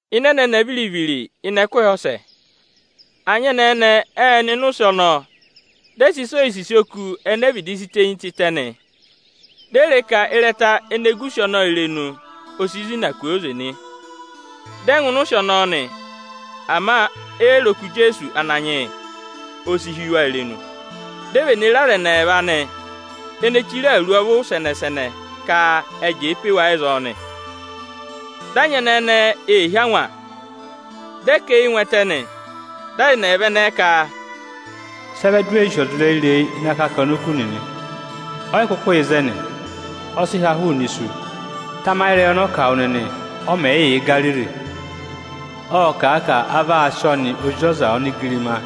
Ịnị ẹnẹnẹ viri-viri ịnị ẹkụhị ọsẹ, anyẹnẹẹ ẹnẹẹ ệ nọ ịnị ụsị ọnọọ, dị ẹ sị ịsa oyisisi oku ene e vịdị si tenyi tịtẹ nị. Di e re ka ịrẹta ene gu ụsị ọnọọ irenu, o si zina kwooze nị. Dị ẹ ngụ ịnị ụsị ọnọọ nị, ama e yi re oku Ijeesu Ananyị yị. O si hí wa irenu, di e vene re aza ẹnị ẹẹva aanị, ene chire awuru ọvụ sẹnẹ-sẹnẹ ka ệ jẹẹ pe wa ịzọọ nị. Dị anyẹnẹẹ ẹnẹẹ ê hí angwa, dị ẹ kà eyi ngụ ẹtẹ nị. Dị aza ẹnị ẹyịva ẹnẹẹ ka, “Sị ẹ vẹ di u wee sì ọza ireyi-ireyi ịnị akakana oku nịnị? Ọ yị kụkụ yà ịzẹnị, ọ sị ha hụụnị isu. Tamayị ịrẹyị ọnị ọ kà wụ nịnị, ọ mẹ̀ yị yà Igariri! Ộ kà a ka a vaa sị ọnị Ozi ọza onigirimaa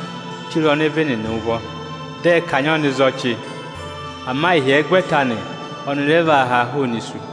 chire ọnịvị nịnị ụvọ, dị ẹ kanyị ọnị za ọchị; ama ịhyẹgwẹta anị, ọnị rẹ vaa haa hụụnị isu.”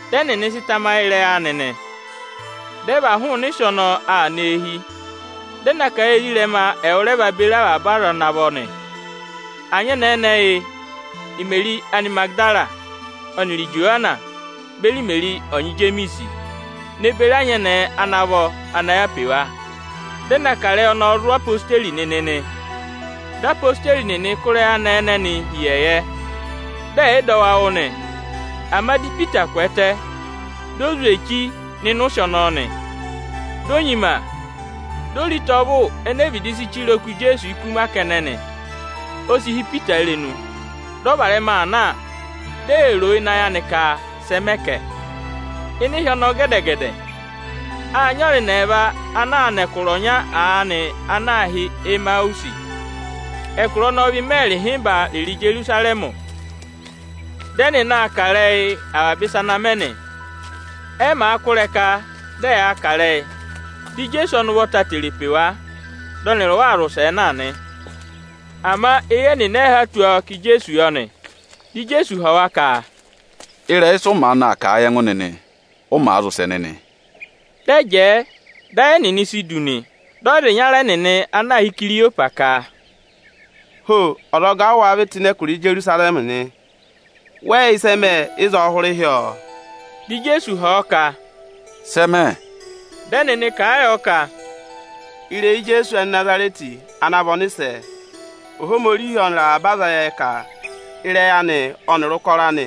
Dị ẹnịnị sị tamayị ịrẹyị anị nị. Dị ẹ và hụụnị ụsị ọnọọ aa nọ eehi, dị ẹ na kà a yị ezirẹma ẹwụrọnya beri avaba aza ana vọ nị. Anyẹnẹẹ ẹnẹẹ yị: Imeri Anịmagịdara ọnịrị Ijowana beri Imeri ọnyị Ijemiisi, ne beri anyẹnẹẹ ana vọ ana yà pe wa. Dị ẹ kà ịrẹyị ọnọnị zụ̀ odeyi nịnị nị. Dị odeyi nịnị kụ́ ịrẹyị anẹẹ ẹnẹnị hi ịyẹyẹ, dị ẹ̀ yị dọ wa wụ́ nị. Ama dị Ipita kwẹẹtẹ, di o zwe echi nọ ịnị ụsị ọnọọ nị. Di o nyima, di o re ịta ọvụ ene e vịdị si chire oku Ijeesu ikuma kẹnẹ nị. O si hí Ipita irenu, dị ọ varẹma aa na, di ee roo ịnị ayị anị ka sẹ mẹ kẹ. Ịnị ịhị ọnọọ gẹdẹ-gẹdẹ, â nyị aza ẹnị ẹẹva ana aa nọ ẹkụra ọnya aanị ana aā hị́ Emawusi. Ẹkụra ọnọọ vị ịmẹẹrị ịhịmba rịrị Ijerusarẹmị. Dị ẹnịnị aa kà ịrẹyị avaba ịsa ana mẹ nị. Ẹ màa kụ́ ịrẹka dị ẹyaa kà ịrẹyị, dị Ijeesu ọnị ụvọta tere pe wa, dị ọnịrị wa aa zị ụsẹẹ na nị. Ama eyi ẹnịnị ẹ yị há tù ọọ ka Ijeesu yọ nị. Dị Ijeesu họ̀ wa ka, “Sị ụ maanị aa kà ịrẹyị anị nịnị, ụ màa zị ụsẹ nịnị?” Dị ẹ jẹẹ, dị ayị ẹnịnị si du nị. Dị ọza ịnyara ẹnịnị ana aā hị́ Ikiriyopasị ka, “Ho! Ọzọga ụ wáá vị tụ́ ịnị ẹkụra Ijerusarẹmị nị? Wẹ yị yẹ ịsị ẹ mẹ ịzọọ hụrẹ ịhyọọọ?” Dị Ijeesu họ̀ ọ ka, “Sẹ mẹ?” Dị ẹnịnị kà a yọ ka, “Ịrẹyị Ijeesu Anịnazarẹtị ana vị ọnịsẹ. Ohomorihi ọnịrị avaba aza ệ yẹ ka ịrẹyị anị ọnịrị ụkọrọ anị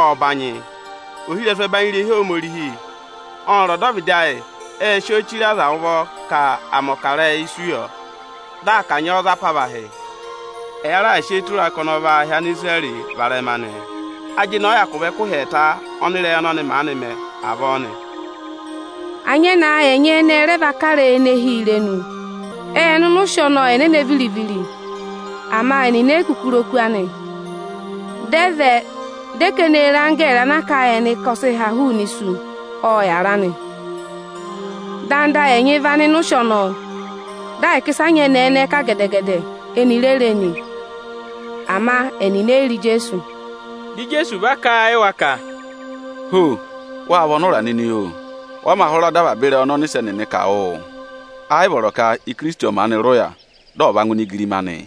ộ banyị. Ohirẹsụ ẹbanyị irehi Ohomorihi ọnịrị ọdọvịdị ayị ệ sị ọọ chire aza ụvọ ka à mẹ̀ ọkarẹyị isu yọ, dị à kanyị ọọ za apavahị. Ẹya raà sị eyi tụra a ka ọnị ọ vaa hị́ Anisirẹrị varẹma nị. Ajịnị ọ hyakụ vị ẹkụhị ẹẹta ọnị ịrẹyị ọnọnị maanị mẹ avọọ nị. Anyẹnẹẹ ayị ẹnyị ẹnị ẹ rẹ va kà ịrẹyị ene hị́ yi irenu. Ệ nọ ịnị ikuta anị ẹnẹnẹ viri-viri, ama ẹnịnị e yi kuku re oku anị. Dị ẹ vẹ, dị ẹ ka ẹnị ê re anggẹẹrị ana kà a yị ẹnị ka ọ sị ha hụụnị isu, ọ yàra nị. Anda ayị ẹnyị ẹ va nọ ịnị ikuta ọnọọ, dị ahịka ịsị anyẹnẹẹ ẹnẹẹ kà gẹdẹ-gẹdẹ, eni re re nị; ama ẹnịnị e yi re Ijeesu.” Dị Ijeesu va aa kà a yị wa ka, “Ho! Wâ vị ọnụra nịnị, oo! Wa mā hụra dọ avaba ịrẹyị ọnị ọnịsẹ nịnị kà wụ́ụ? Ẹ yị vọrọ ka Ikirisiti ọ̀ maanị rị ụya, dị ọ̀ va ngụ ịnị igirima anịị?”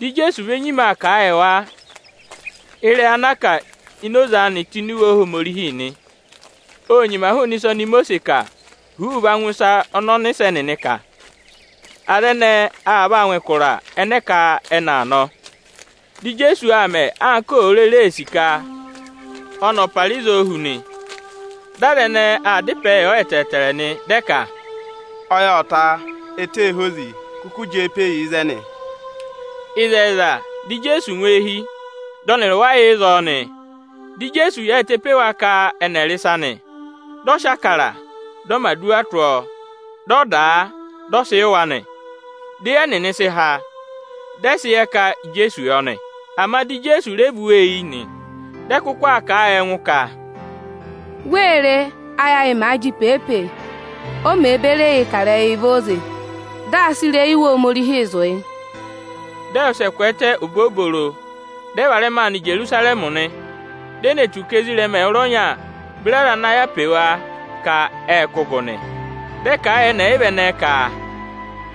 Dị Ijeesu ve nyima aa kà a yị wa ịrẹyị ana a kà ini oze anị tụ́ Iwe Ohomorihi nị. Ô nyima hụụnị ịsa oni Imosiisi kà huuu va ngụ ịsa ọnị ọnịsẹ nịnị kà. Aza ẹnẹẹ aa vaa ngụ ẹkụra ẹnẹ ẹ ka ẹnị aa nọ. Dị Ijeesu aa mẹ anka òo rere ee sì ka ọnị ọ̀ para ịzọọ hu nị. Dị aza ẹnẹẹ aa dá ịpẹẹ yọ ẹtẹẹtẹrẹ nị, dị ẹ ka, “Ọyị ộ ta, ẹtẹ ee hozi, kụkụ jẹẹ pe yi ịzẹnị!” Ịzẹyịza, dị Ijeesu ngụ eehi, dị ọnịrị wa yà ịzọọ nị. Dị Ijeesu yaayịtẹ pe wa ka ẹnị ẹ̀ rị ịsa nị. Dị ọ sị Ịbụrẹẹdị, dị ọ mẹ̀ aduwa tụ́ ọọ, dị ọ dà a, dị ọ sị yị wa nị. Di eyi ẹnịnị sị há, dị ẹ sị yẹ ka Ijeesu yọ nị. Ama dị Ijeesu re vú wa eyi nị. Dị ẹ kụkụ aa kà a yị ẹngụ ka, “Wee re, áyị ayị màa jị pee-pee, o mèe beri eyii kà ịrẹyịị vẹ óze, dị aa sị ịrẹyị Iwe Ohomorihi zụ̀ yị?” Dị ẹ wụsẹ kwẹẹtẹ obobooro, dị ẹ varẹma aa nọ Ijerusarẹmị nị. Di e ne tù ka ezirẹma ẹwụrọnya beri aza ana yà pe wa ka ệ kụ́ gụ nị. Dị ẹ kà a yị ẹnị ẹyịva ẹnẹẹ ka,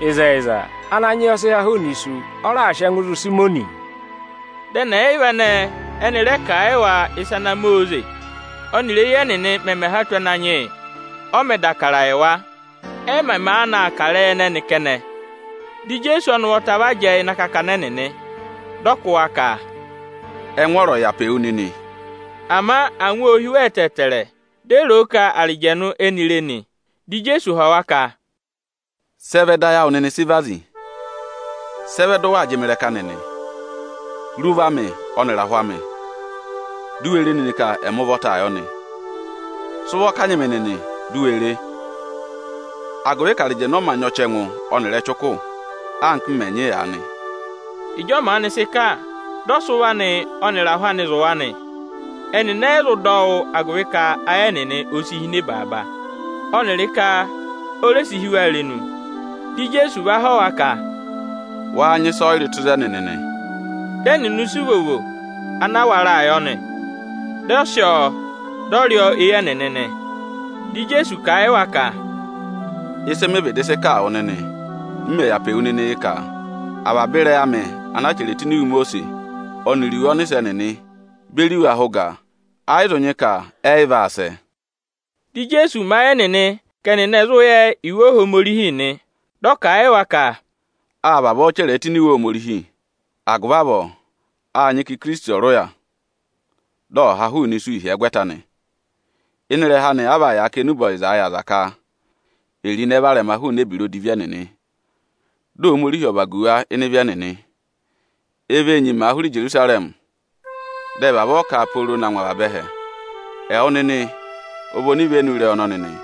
“Ịzẹyịza, Ananyị yị ọ sị ha hụụnị isu, ọ raà sị ẹngụ zụ̀ Ịsayịmọnị!” Dị ẹnị ẹyịva ẹnẹẹ ẹnị rẹ kà a yị wa ịsa ana mẹ óze, ọnịrị éyi ẹnịnị mẹmẹ há tù Ananyị yị, ọ mẹ̀ dà Ịbụrẹẹdị yị wa. Ẹ mẹ̀ maanị aa kà ịrẹyị ẹnẹnị kẹnẹ, di Ijeesu ọnị ụvọta vana jẹẹ ịnị akakana ẹnịnị, dị ọ kụ́ wa ka, “Ẹngwọọrọ ọ̀ vị áawụ nịnị!” Ama angwa ô hí wa ẹtẹẹtẹrẹ, di e ro o ka arịjẹnụ éni ee re nị. Dị Ijeesu họ̀ wa ka, “Sị ẹ vẹ dị ayị awụ nịnị sị vazi? Sị ẹ vẹ dị ụ waa jị mị ịrẹka nịnị? Re ụvọ amị ọnịrị ahụ amị, di u we re nịnị ka ẹmị ụvọtaa yọ nị. Sị ụvọ kanyị mị nịnị, di u we re; agụvị ka arịjẹnụ ọ mā nyị ọchẹngụ ọnịrị ẹchụkụ, anka m mẹ̀ nyị aanị.” Ịjị ọ maanị sị kà, dị ọ sị ụvọ anị ọnịrị ahụ anị zụ̀ wa nị. Ẹnịnị ẹ̀ yị zụ dọ ọ wụ́, agụvị ka ayị ẹnịnị o si hine baaba, ọnịrị ka o re si hí wa irenu. Dị Ijeesu va họ̀ wa ka, “Wáá nyị ịsọyịrị tụ́ ịzẹnị nịnị?” Dị ẹnịnị sị ivovo ana a waraa yọ, dị ọ sị ọọ, dị ọ rị ọọ éyi ẹnịnị nị. Dị Ijeesu kà a yị wa ka, “Ịsị mị vịdị sị kà a wụ nịnị, m mẹ̀ yà pe wu nịnị, yị, ka: Avaba ịrẹyị amị ana a chẹrẹ tụ́ Iwe Imosiisi ọnịrị iwe ọnịsẹ nịnị beri iwe ahẹ ụga, ẹ yị zụ nyị ka ẹ yị vaa sẹ”. Dị Ijeesu mẹ ayị ẹnịnị ka ẹnịnị ẹ̀ zụ yẹ Iwe Ohomorihi nị. Dị ọ kà a yị wa ka, “Â vavọọ chẹrẹ ẹ tụ́ ini Iwe Ohomorihi. Agụvị avọọ â nyị ka Ikirisiti ọ̀ rị ụya, dị ọ ha hụụnị isu ịhyẹgwẹta anị. Ịnị ịrẹha anị a vaa yàa kà enube ọyịzaa yị aza ka è ro ịnẹ varẹma hụụnị ebira odivi ẹnịnị, dị Ohomorihi ọ̀ vagu wa ịnị ịvị ẹnịnị nị. E vee nyimaa hụrẹ Ijerusarẹmị, dị ẹ vavọọ kà a pooro na ngụ avaba ẹhẹ. Ẹwụ nịnị ọ vị onivenu ịrẹyị ọnọnị nị.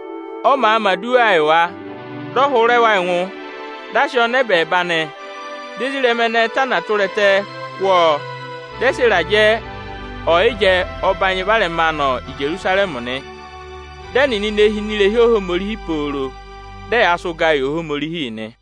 Ọ màa mẹ̀ aduwaa yị wa, dị ọ hụrẹ wa ẹngụ, dị a sị ọọ nọ ẹbẹẹba nị. Dị ezirẹma ẹnẹẹ tana tụra ẹtẹ kụ́ ọọ, dị ẹ sị ịrajẹ ọyịjẹ ọbanyị varẹma aa nọ Ijerusarẹmị nị. Dị ẹnịnị ne hi ini irehi Ohomorihi pooro, dị ẹyaa sị ụgaa yị Ohomorihi nị.